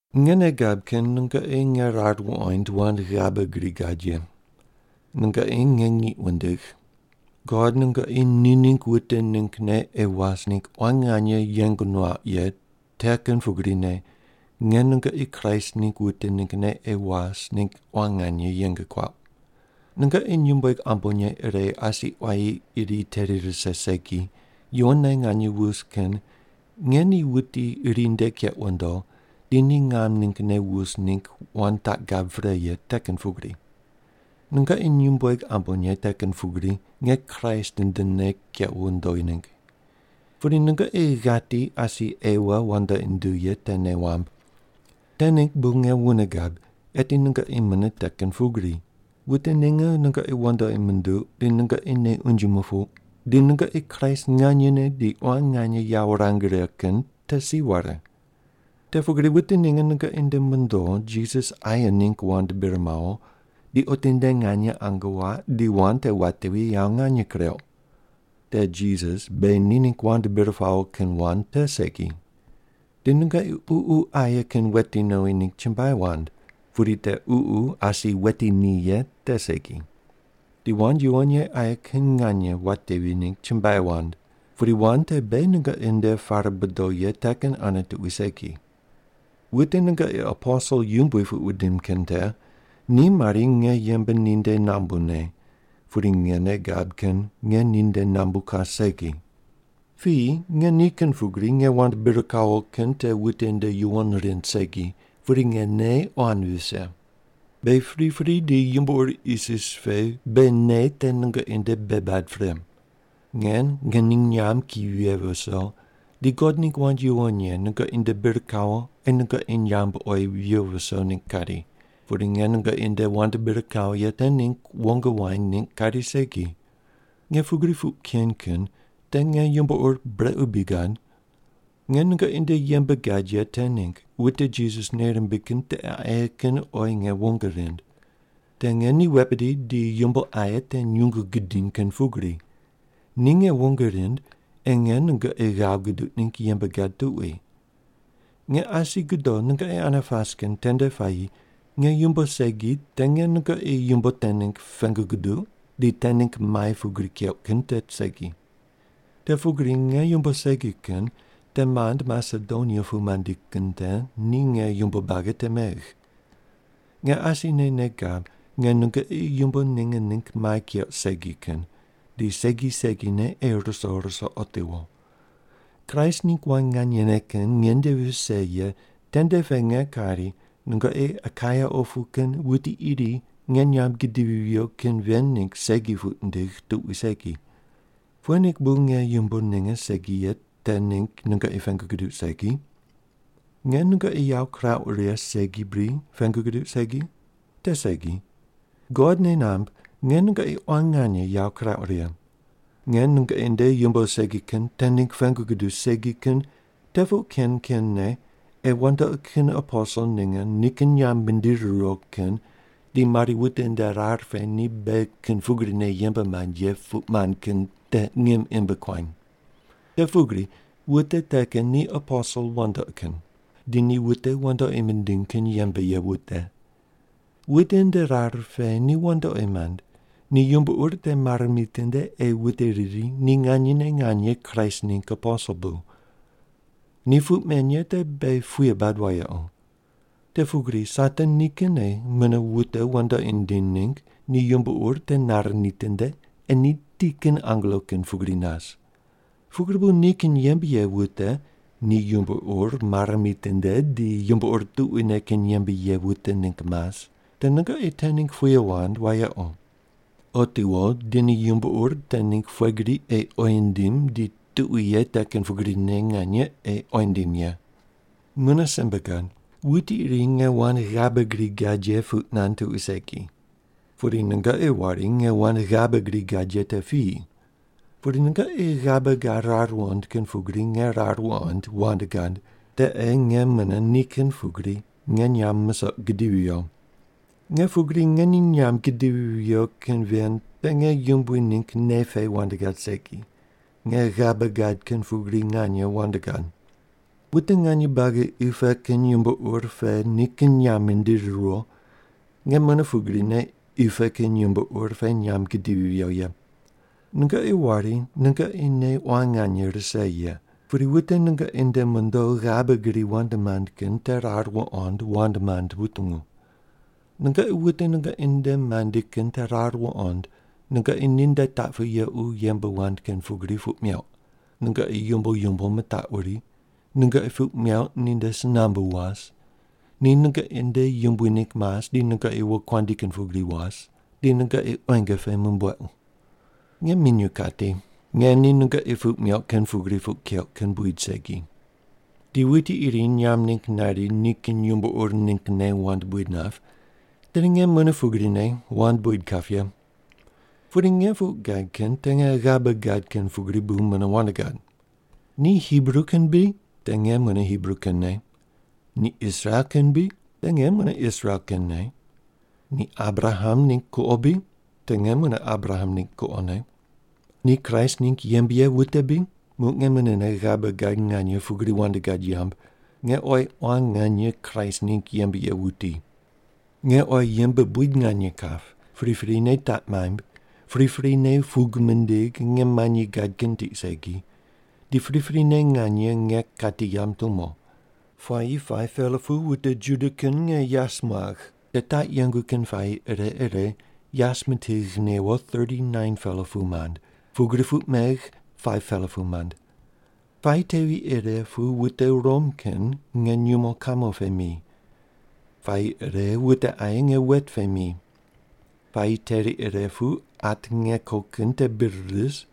Nge nei gab kin nungoqi nge rar wuqoind wand ghabe gri gad ye. Nungoqi nge ngiq wundigh. God nungoqi ni ningg wute ninggne ei was ningg quan nganye yeng nuauq ye te kin pugrine nge nungoqi Kraist ningg wute ninggne ei was ningg quan nganye yeng kuauq. Nungoqi nyumbueg ambonye ire asi quayi iri teri rise segi, yuwonne nganye wus kin nge ni wuti iri nde keq wundo di ni ngam ninggne wus ningg wand taq gab pre ye te kin pugri. Nungoqi nyumbueg ambonye te kin pugri nge Kraist ndene kequ wondo ningg. Pudi nungoqi ghati asi Ewa wandoqi nunduw ye te nei wamb. Te ningg bu nge wune gab, eti nungoqi mune te kin pugri: Wute ninge nungoqi wandoqi munduq di nungoqi nei unje mupuq di nungoqi Kraist nganyene di quan nganye yawo wurang righe kin te si ware. Te pugri wute ninge nungoqi nde mondo Jisas aye ningg wand bir mawo di otinde nganye ange waq di wand te watevi yawo nganye kureuq. Te Jisas beghi ni ningg wand bir pawo kin wand te segi. Di nungoqi ququ aye kin weti nowi ningg chumbuai wand, pudi te Ququ asi wetini ye te segi. Di wand yuwon ye aye kin nganye watevi ningg chumbuai wand, pudi wand te beghi nungoqi nde pare bodo ye te kin ane tuqui segi. Wute nungoqi “aposel yumbui” puq wundim kin te ni mari nge yembe ninde nambune, pudi nge nei gab kin nge ninde nambu kas segi. Piyi nge ni kin pugri nge wand bir kawo kin te wute nde yuwon rind segi, pudi nge nei quan vise. Beghi pripri di yumbo ur isis pe beghi nei te nungoqi nde bei bad pre. Nge ngening nyamb ki vighe viso di God ningg wand yuwon ye nungoqi nde bir kawo ei nungoqi nyamb oyi viyo viso ningg kari, pudi nge nungoqi nde wand bir kawo ye te ningg wong waind ningg kari segi. Nge pugri puq ken kin te nge yumbo ur brequ bri gad? Nge nungoqi nde yembe gad ye te ningg wute Jisas nei rimbig kin tiqe aye kin oyi nge wong rind. Te nge ni wet bidi di yumbo aye te nyungu gidiny kin pugri. Ni nge wong rind ei nge nungoqi ghav guduq ningg yembe gad tuqui. Nge asi godo nungoqi ane pas kin tende puayi nge yumbo segi te nge nungoqi yumbo te ningg pengu guduq di te ningg mai pugri keuq kin te segi. Te pugri nge yumbo segi kin te mand Masedonia pu mandi kin te ni nge yumbo buagi te megh. Nge asine nei gab nge nungoqi yumbo ninge ningg mai keuq segi kin, di segi segine ei ruso ruso otiwo. Kraist ningg wand nganye kin nge nde vise ye tende pe nge kari nungoqi Akaia opu kin wuti iri nge nyamb gidivi viyo kin ven ningg segi puq nindigh tuqui segi. Pughe ningg bu nge yumbo ninge segi ye te ningg nungoqi pengu guduq segi? Nge nungoqi yawo kirauq righe segi bri pengu guduq segi? Te segi. God nei namb nge nungoqi quan nganye yawo kirauq righe. Nge nungoqi nde yumbo segi kin te ningg pengu guduq segi kin te puq ken kenne ei wandoqi kin aposel ninge nikin nyamb mindiri riwo kin di mari wute nde rar pe ni beghi kin pugrine yembe mand ye puq mand kin te ngim imb kuam. Te pugri wute te kin ni aposel wandoqi kin, di ni wute wandoqi mindiny kin yembe ye wute. Wute nde rar pe ni wandoqi mand ni yumbo ur te mare mitinde ei wute riri ni nganyene nganye Kraist ningg aposel bu. Ni puq men ye te beghi puye bad wayequ. Te pugri Satan nikinne mune wute wandoqi nindiny ningg ni yumbo ur te nare nitinde ei ni ti kin angelo kin pugri nas. Pugri bu nikin yembe ye wute ni yumbo ur mare mitinde di yumbo ur tuquine kin yembe ye wute ningg mas, te nungoqi te ningg puye wand wayequ. Otiwo di ni yumbo ur te ningg pughe gri ei oyi nindim di tuqui ye te kin pugrine nganye ei oyi nindim ye. Mune simbe gad. Wuti iri nge wand ghabe gri gad ye puq nand tuqui segi. Pudi nungoqi wari nge wand ghabe gri gad ye te piyi. Pudi nungoqi ghabe gad rar wuqond kin pugri nge rar wuqoind wand gad, te ei nge mune ni kin pugri nge nyamb musoq gidivi viyo. Nge pugri ngening nyamb gidivi viyo kin ven te nge Yumbui ningg nei pe wand gad segi. Nge ghabe gad kin pugri nganye wand gad. Wute nganye buagi qi pe kin yumbo ur pe nikin nyamb mindiri riwo, nge mune pugrine qi pe kin yumbo ur pe nyamb gidivi viyo ye. Nungoqi wari nungoqi nei quan nganye rise ye, pudi wute nungoqi nde mondo ghabe gri wand mand kin te rar wuqond wand mand wutungu. Nungoqi wute nungoqi nde mandi kin te rar wuqond nungoqi ninde taq pu yequ yembe wand kin pugri puq meuq, nungoqi yumbo yumbo mitaquri, nungoqi puq meuq ninde si nambu was, ni nungoqi nde yumbui ningg mas di nungoqi wokuandi kin pugri was, di nungoqi quenge pe mumbuequ. Nge minyuw kati, nge ni nungoqi puq meuq kin pugri puq keuq kin buid segi. Di wuti iri nyamb ningg nari nikin yumbo ur ninggne wand buid nap, tedi nge mune pugrine wand buid kap ye. Pudi nge puq gad kin te nge ghabe gad kin pugri bu mune wand gad. Ni Hibru kin bri? Te nge mune Hibru kinne. Ni Israel kin bri? Te nge mune Israel kinne. Ni Abraham ningg kuqo bri? Te nge mune Abraham ningg kuqone. Ni Kraist ningg yembe ye wute bri? Muq nge munene ghabe gad nganye pugri wand gad yamb, nge oyi quan nganye Kraist ningg yembe ye wuti. Nge oyi yembe buid nganye kap, priprine taq maimb, priprine pug mindigh nge manyi gad kin tiq segi, di priprine nganye nge kati yamb tumo. Puayi 5-pela pu wute Juda kin nge yas muagh. Te taq yengu kin puayi ire ire yas mitigh newo 39-pela pu mand, pugri puq megh 5-pela pu mand. Puayi tevi ire pu wute Rom kin nge nyumo kamo pe mi. Puayi ire wute aye nge wet pe mi. Puayi teri ire pu at nge ko kin te bir ris,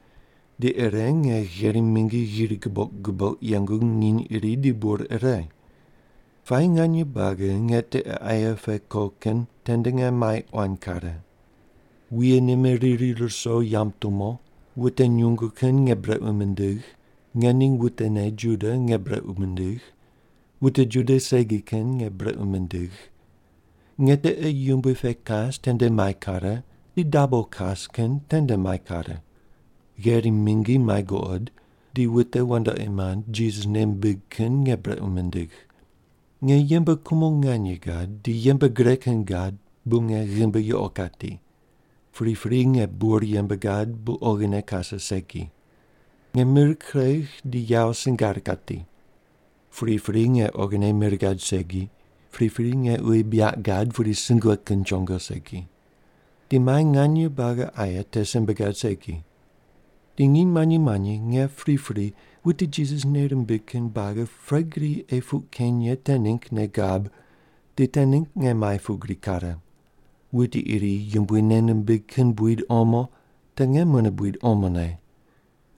di ire nge gherim mingi ghiri guboq guboq yengu nginy iri di bur ire. Puayi nganye buagi nge tiqe aye pe ko kin tende nge mai quan kare. Wuye nime riri ruso yamb tumo, wute nyungu kin nge brequ mindigh, ngening wutene Juda nge brequ mindigh, wute Juda segi kin nge brequ mindigh. Nge tiqe yumbui pe kas tende mai kare, di dabo kas kin tende mai kare. Gherim mingi mai guqod, di wute wandoqi mand Jisas nei mimbig kin nge brequ mindigh. Nge yembe kumo nganye gad di yembe gre kin gad bu nge ghimbi yuqo kati. Pripri nge bur yembe gad bu oghine kase segi. Nge mir kuregh di yawo singar kati. Pripri nge oghine mir gad segi, pripri nge uyi buyaq gad pudi sungue kin chongo segi. Di mai nganye buagi aye te simbe gad segi. Di nginy manyi manyi nge pripri wute Jisas nei rimbig kin buagi pughe gri ei puq keny ye te ningg nei gab, di te ningg nge mai pugri kare. Wuti iri Yumbui nei nimbig kin buid omo, te nge mune buid omone.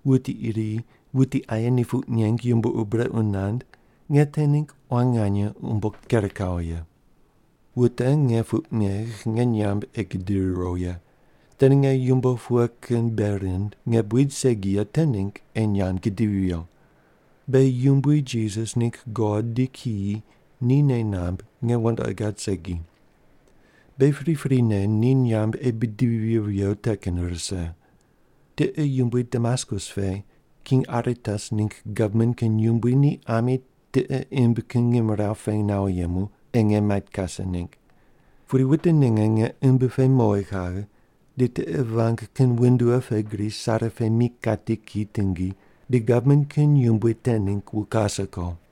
Wuti iri, wuti aye ni puq neng yumbo ur brequ nand, nge te ningg quan nganye umbo ker kawo ye. Wute nge puq megh nge nyamb ei gidiri riwo ye, tedi nge yumbo pughe kin bei rind nge buid segi ye te ningg ei nyamb gidivi viyo. Beghi Yumbui Jisas ningg God di kiyi ni nei namb nge wandoqi gad segi. Beghi priprine ni nyamb ei bidivi viyo viyo te kin rise. Tiqe yumbui Damaskus pe King Aretas ningg gavman kin yumbui ni ami tiqe imb kin ngimrawu pe nawo yemu ei nge mait kase ningg. Pudi wute ninge nge imbi pe mowi kaghe di tiqe vang kin windua pe gri sare pe mi kati ki tingi di gavman kin yumbui te ningg wu kase ko.